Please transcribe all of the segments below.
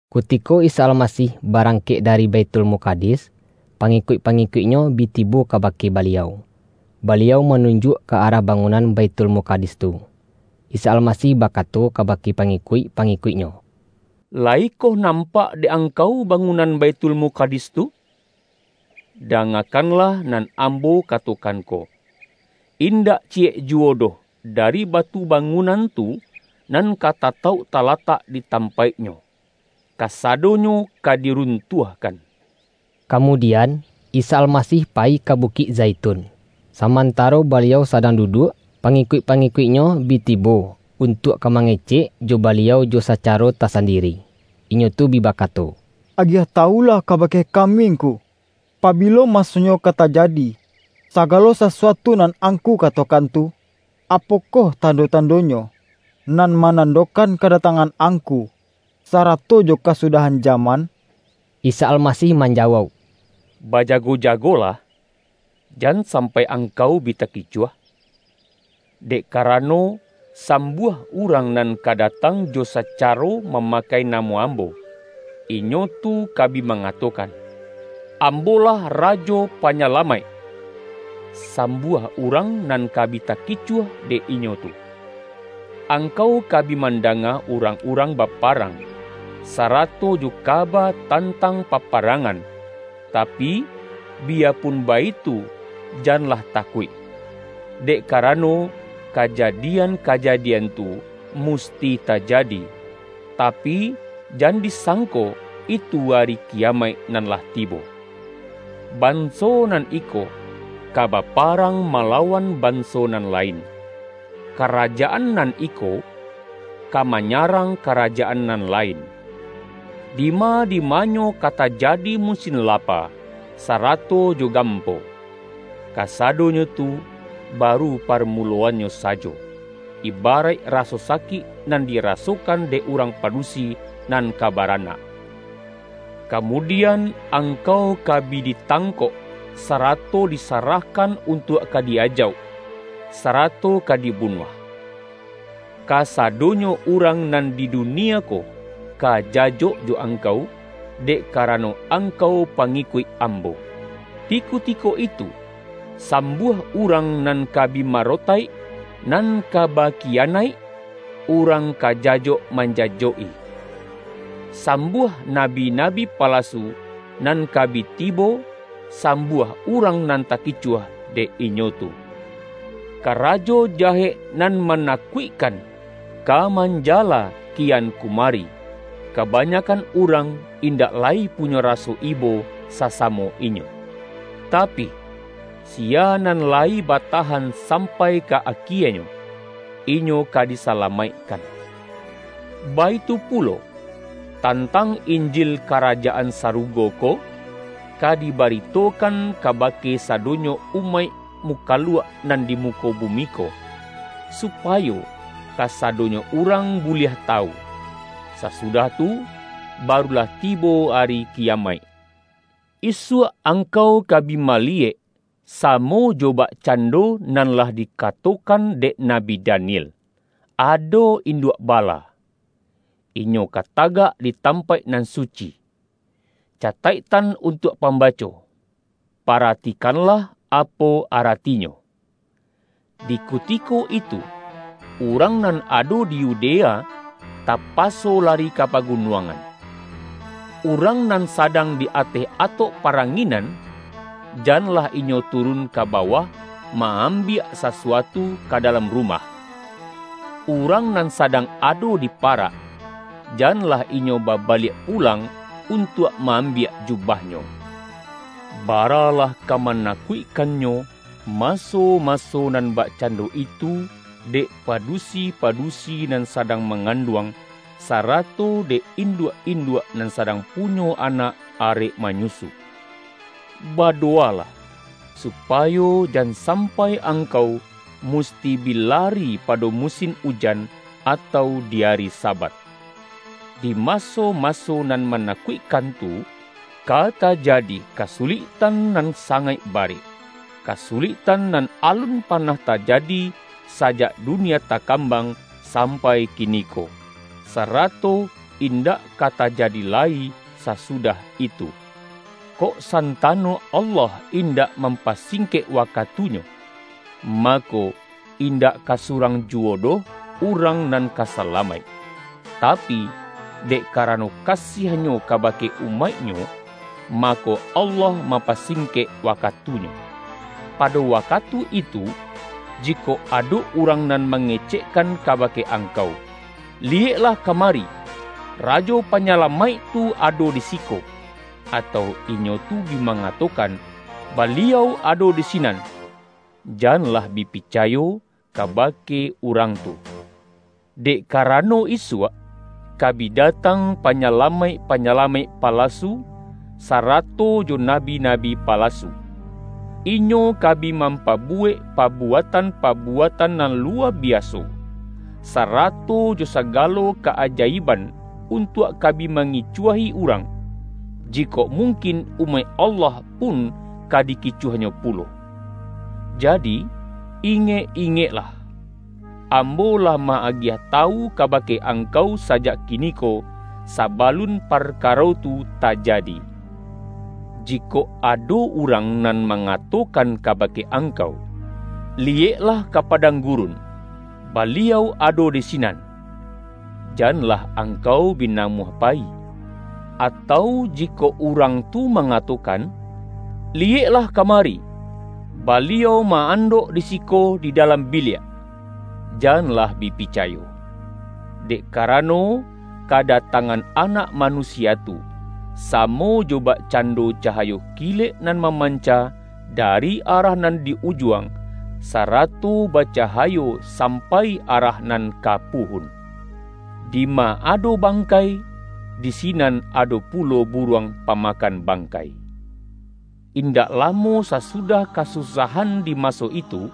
Kutiko Isa Almasih barang-kek dari Baithulmukadis, pa-ngikuik-pangikuik-Nyo bi tibo kaba-ke Baliau, Baliau manunjuak ka arah bangunan Baithulmukadis tu. Isa Almasih bakato kabake pangikuik-pa-ngikuik-Nyo,”Layi koh nampak dek angkau bangunan Baithulmukadis tu? Dangakanlah nan Ambo katokan ko, indak ciyek juwo doh dari batu bangunan tu, nan ka tatauk talatak di tampaiknyo. Kasadonyo ka dirun-tuahkan.” Kamudian, Isa Almasih payi ka Bu-kik Zaitun, samantaro Baliau sadang duduak, pangikuik-pangikuik-Nyo bi tibo untuak ka mangecek jo Baliau jo sacaro tasandiri. Inyo tu bi bakato,”Agiah tawulah kabake kami Ngku, pabilo masonyo ka tajadi sagalo sa-suatu nan Angku katokan tu. Apokoh tando-tandonyo, nan manandokan ka-datangan Angku, sarato jo kasudah-an jaman?” Isa Almasih manjawauk,”Bajago-jagolah, jan sampai angkau bi taki-cuah. Dek karano, sambuah urang nan ka datang jo sacaro mamakai na-mo Ambo, inyo tu ka bi mangatokan, ’Ambo-lah Rajo Panyalamaik!’ Sam-buah urang nan ka bi takicuah dek inyo tu. Angkau ka bi mandanga urang-urang baparang, sarato jo kaba tan-tang paparangan, tapi, biyapun baitu janlah takuik. Dek karano, kajadian-kajadian tu musti tajadi, tapi, jan di-sangko itu ari kiyamaik nan lah tibo. Banso nan iko, ka baparang malawan banso nan lain, karajaan nan iko, ka manyarang karajaan nan lain. Dima-dimanyo ka tajadi musin lapa, sarato jo gampo. Kasadonyo tu baru parmuloannyo sajo, ibaraik raso sakik nan dirasokan dek urang padusi nan ka baranak. Kamudian, angkau ka bi ditang-kok, sarato disarahkan untuak ka di-ajauk, sarato ka dibunuah. Kasado-nyo urang nan di dunie ko ka jajok jo angkau, dek karano angkau pangi-kuik Ambo. Di kutiko itu, sambuah urang nan ka bi marotaik, nan ka ba-kiyanaik, urang ka jajok manjajok-i. Sambuah nabi-nabi palasu nan ka bi tibo, sambuah urang nan takicuah dek inyo tu. Karajo jahek nan mana-kuikkan, ka manjala kian kumari, ka-banyakan urang, indak lai punyo raso ibo sasamo inyo. Tapi, siya nan lai batahan sampai ka akienyo, inyo ka disalamaikkan. Baitu pulo, tantang Injil Karajaan Sarugo ko, ka dibarito-kan kabake sadonyo umaik mukaluak nan di muko bumi ko, supayo kasado-nyo urang buliah tawu. Sasudah tu, barulah tibo ari kiyamaik.” ”Isuak angkau ka bi maliyek, sa-mo jo bakcando nan lah dikatokan dek Nabi Daniel, ado ’Induak Bala.’ inyo ka tagak di tampaik nan suci. (Cataik-tan untuak pambaco: Paratikanlah apo aratinyo!) Di kutiko itu, urang nan ado di Yudea tapaso lari ka pagu-nuangan. Urang nan sadang di ateh atok paranginan, janlah inyo turun ka bawah ma-ambiak sasuatu ka da-lam rumah. Urang nan sadang ado di parak, janlah inyo babaliak pulang untuak ma-ambiak jubahnyo. Bara-lah ka manakuikkannyo, maso-maso nan bakcando itu dek padusi-padu-si nan sadang manganduang, sarato dek induak-induak nan sadang punyo anak arek manyusu! Badowalah, su-payo jan sampai angkau musti bi lari pado musin ujan, atau di ari Sabat! Di maso-maso nan manakuikkan tu, ka tajadi kasuliktan nan sangaik ba-rek, kasuliktan nan alun panah tajadi sajak dunie takambang sampai kini-ko, sarato indak ka tajadi lai sasudah itu. Kok santano Allah indak mam-pasingkek wakatunyo; mako, indak ka surang juwo doh urang nan ka sa-lamaik. Tapi, dek karano kasiah-Nyo kabake umaik-Nyo, mako, Allah mam-pasingkek wakatunyo. Pado wakatu itu, jikok ado urang nan mangecekkan kabake angkau, ’Li-yeklah kamari, Rajo Panyalamaik tu ado di siko!’ atau inyo tu bi mangato-kan ’Baliau ado di sinan!’ —janlah bi picayo kabake urang tu. Dek karano isuak, ka bi datang panyalamaik-pa-nyalamaik palasu, sarato jo nabi-nabi palasu. Inyo ka bi mampabuwek pa-buatan-pabuatan nan luwa biaso, sa-rato jo sagalo ka-ajaiban, untuak ka bi mangicuahi urang, jikok mungkin umaik Allah pun ka dikicuahnyo pu-lo. Jadi, ingek-ingeklah! Ambo lah ma-agiah tawu kabake angkau sajak kiniko, sabalun parkaro tu tajadi. Jikok ado urang nan mangatokan kabake angkau, ’Liyeklah ka padang gurun, Baliau ado di sinan!’ —janlah angkau bi namuah payi. Atau jikok urang tu mangatokan, ’Liyeklah kama-ri, Baliau maandok di siko di dalam biliak!’ —janlah bi picayo. Dek kara-no, kadatangan Anak Manusia tu, samo jo bakcando cahayo kilek nan maman-ca, dari arah nan di Ujuang, sarato ba-cahayo sampai arah nan ka Puhun. Dima ado bangkai, di sinan ado pulo buruang pamakan bangkai.” ”Indak lamo sasudah kasusahan di maso itu,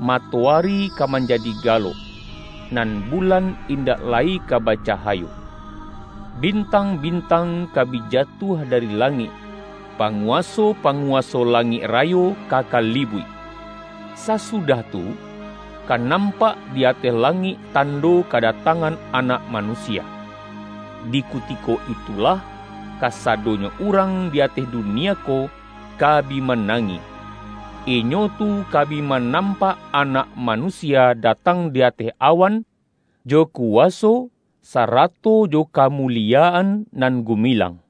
matoari ka manjadi galok, nan bulan indak lai ka bacahayo. Bintang-bintang ka bi jatuah dari la-ngik, panguwaso-panguwaso langik ra-yo ka kalibuik. Sasudah tu, ka nam-pak di ateh langik tando kadatangan Anak Manusia. Di kutiko itulah kasa-donyo urang di ateh dunia ko, ka bi manangih. Inyo tu ka bi manampak Anak Manusia datang di ateh awan, jo kuwaso sarato jo kamuliyaan nan gumilang.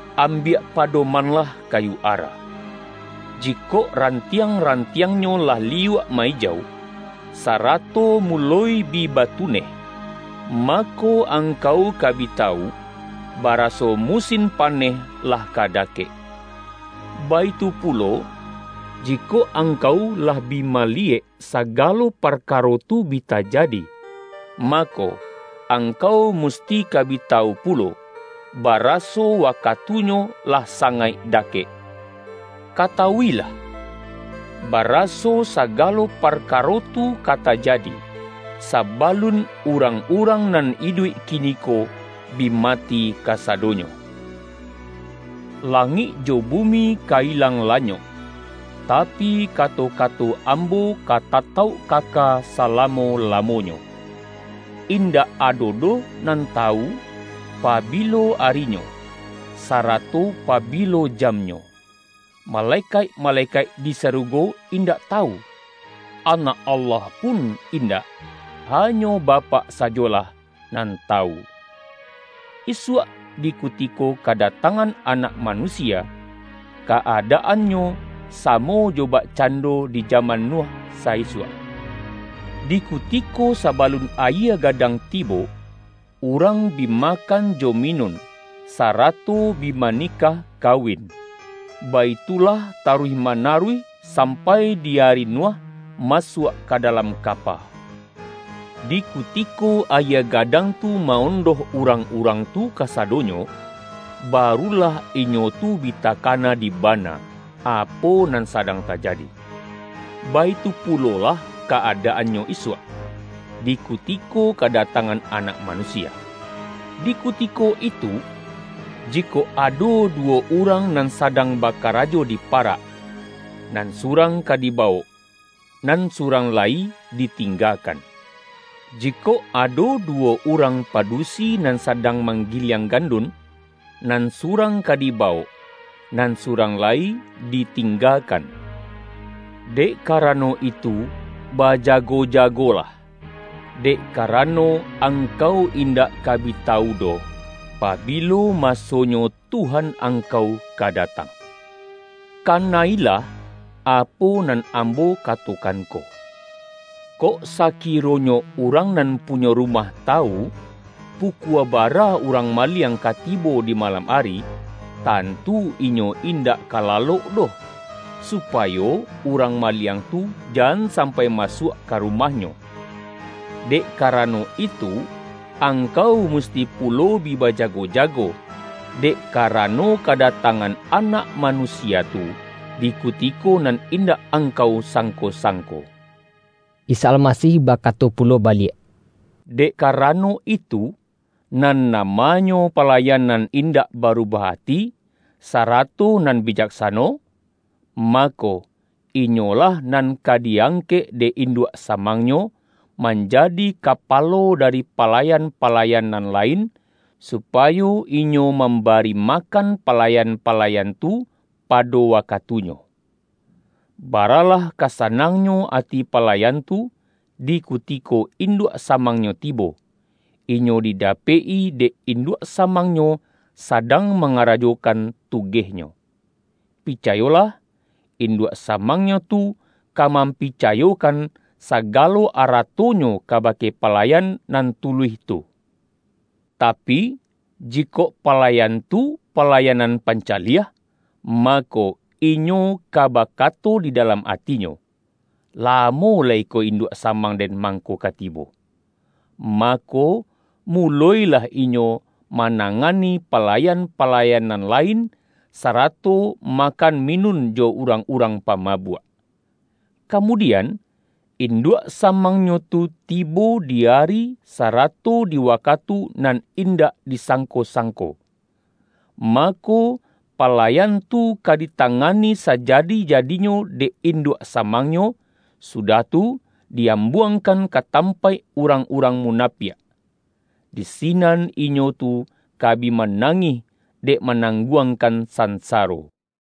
”Ambiak padomanlah kayu ara. Jikok rantiang-rantiangnyo lah liyuak ma-ijau, sarato muloi bi batuneh, ma-ko, angkau ka bi tawu, baraso musin paneh lah ka dakek. Baitu pulo, ji-kok angkau lah bi maliyek sagalo par-karo tu bi tajadi, mako, angkau mus-ti ka bi tawu pulo, baraso wakatunyo lah sangaik dakek. Katawuilah! Ba-raso sagalo parkaro tu ka tajadi, saba-lun urang-urang nan iduik kiniko bi mati kasadonyo. Langik jo bumi ka ilang lanyok, tapi, kato-kato Ambo ka tatauk kaka salamo-lamonyo.” ”Indak ado doh nan tawu, pabi-lo arinyo, sarato pabilo jamnyo, male-kaik-malekaik di sarugo indak tawu, Anak Allah pun indak, hanyo Bapak sajolah nan tawu. Isuak di kutiko kadatangan Anak Manusia, ka-adaan-nyo samo jo bakcando di jaman Nuh sa-isuak. Di kutiko sabalun ayie ga-dang tibo, urang bi makan jo minun, sarato bi banikah kawin. Baitulah taruih manaruih sampai di ari Nuh ma-suak ka dalam kapa. Di kutiko ayie gadang tu ma-ondoh urang-urang tu kasadonyo, barulah inyo tu bi takana di bana, apo nan sadang tajadi. Baitu pulolah ka-adaannyo isuak, di kutiko kadatangan Anak Manusia. Di kuti-ko itu, jikok ado duwo urang nan sa-dang bakarajo di parak: Nan surang ka dibawok, nan surang lai ditingga-kan. Jikok ado duwo urang padu-si nan sadang manggiliang gandun: Nan surang ka dibawok, nan surang lai ditinggakan. Dek karano itu ba-jago-jagolah, dek karano angkau in-dak ka bi tawu doh, pabilo masonyo Tuhan angkau ka datang. Kana-ilah apo nan Ambo katokan ko! Kok saki-ronyo urang nan punyo rumah tawu, pukua bara urang maliang ka tibo di malam ari, tantu inyo indak ka lalok doh, supayo urang maliang tu jan sam-pai masuak ka rumahnyo. Dek ka-rano itu, angkau musti pulo bi baja-go-jago. Dek karano kadatangan Anak Manusia tu, di kutiko nan indak ang-kau sangko-sangko.” Isa Almasih bakato pulo baliak,”Dek karano itu, nan namanyo palayan nan indak barubah ati, sarato nan bi-jaksano? Mako inyolah nan ka di-ang-kek dek induak samangnyo, manjadi kapalo dari palayan-palayan nan lain, supayo inyo mambari makan palayan-palayan tu pado wakatunyo. Baralah ka sanangnyo ati palayan tu, di kuti-ko induak samangnyo tibo, inyo dida-pek-i dek induak samangnyo sadang mangarajokan tugehnyo. Picayolah, induak samangnyo tu ka mampicayo-kan sagalo aratonyo kabake palayan nan tuluih tu. Tapi, jikok palayan tu, palayan nan pancaliah, mako inyo ka bakato di dalam atinyo, ’Lamo lai ko induak samang den mangko ka tibo.’ mako muloilah inyo manangani palayan-palayan nan lain, sarato ma-kan minun jo urang-urang pamabuak. Kamudian, induak samangnyo tu ti-bo, di ari, sarato di wakatu nan indak disangko-sangko. Mako, palayan tu ka ditangani sajadi-jadinyo dek induak samangnyo, sudah tu, di-ambuangkan ka tampaik urang-urang munapiak. Di sinan inyo tu ka bi manangih, dek manang guangkan sansaro.”